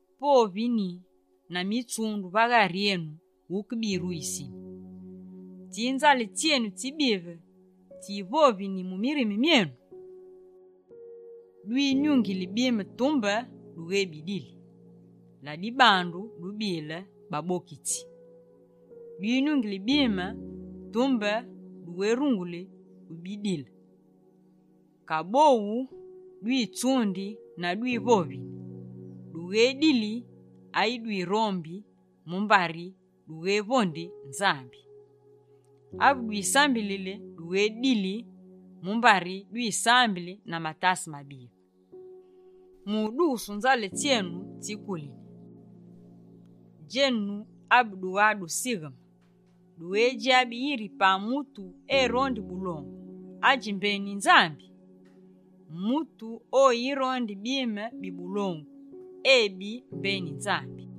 Povini na mitsundu va ghari enu wuke biruyisini? Tsi nzale tsyenu tsibive tsivovini mu mirime myenu? Dwinyungili bime tumbe dughébidili. Ladibandu, dubile babokitsi. Dwinyungili bime, tumbe dughérunguli ubidile. Kaboghu dwitsundi na dwivovini. Dughédili ayi dwirombi, mumbari dughévondi Nzambi. Ave dwisambili dughédili, mumbari dwisambili na matase mabive, mu udugusu nzale tsyenu tsikulini. Djenu abe dugha dusigheme, dughédjabi yiri pa mutu erondi bulongu, adji mbeni Nzambi? Mutu oyirondi bime bi bulongu, ebi mbeni Nzambi.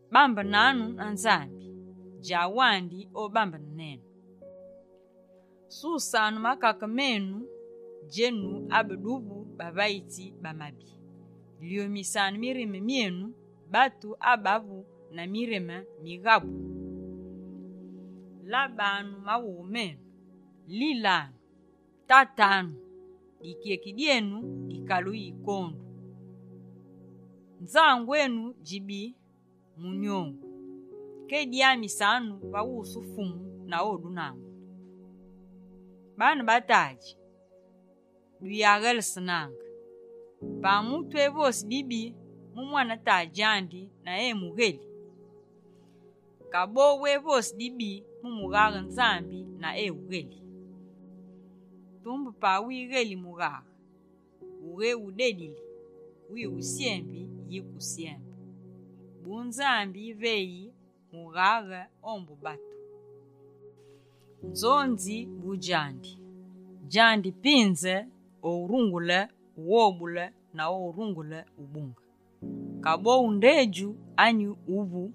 Bambenanu na Nzambi, djawandi obambene nenu. Susanu makake menu, djenu abeduvu bavayitsi ba mabi. Lyomisanu mirime myenu, batu abavu na mirime mighabu. Labanu maghughe menu, lilanu, tatanu, dikyeki dyenu dikaluyi kondu, nzangu enu djibi munyongu. Kedyamisanu va wusu Fumu na odunangule. Baane ba tadji, duyaghélesenaange. Pa mutu evosi dibi mu mwane tadji andi na emugheli, kaboghu evosi dibi mu mughaghe Nzambi na ewugheli. Tumbe pa wigheli mughaghe, wughéwudedili, wiwusyembi yike usyembe. Bu Nzambi yiveyi mughaghe ombu batu. Nzonzi bu djandi. Djandi pinze o wurungule ughobule na orungule ubunge. Kaboghu ndedju anyi wuvu,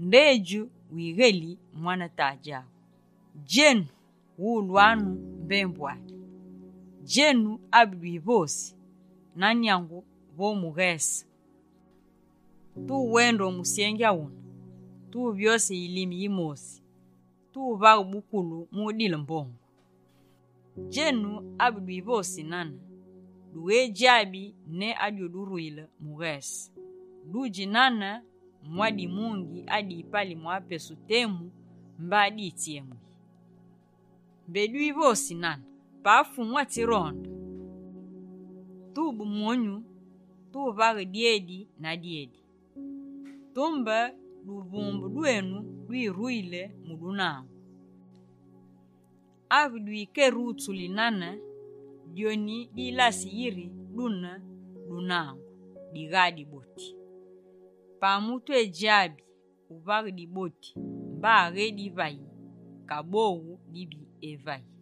ndedju wigheli mwane tadji aghu? Djenu, wulwanu mbembu ami, djenu abedwivosi: «Na nyangu vo mughese, tuwende o musyengi awune, tuyévyose yilime yimosi, tuvaghe bukoli mu udile mbongu.» Djenu abedwivosi nane, dughédjabi ne adwiyuduruyile mughese. Dudji nane mwa dimungi adipali mwa pesu temu, mba ditsyemuyi. Mbé dwivosi nane: «Pa Fumu atsironde, tube monyu, tuvaghe dyedi na dyedi.» Tumbe duvumbe dwenu dwiruyili mu dunangu, ave dwikerutsuli nane dyoni dilasi yiri dune dunangu, digha diboti. Pa mutu edjabi uvaghe diboti mba aghédivayi, kaboghu dibi evayi.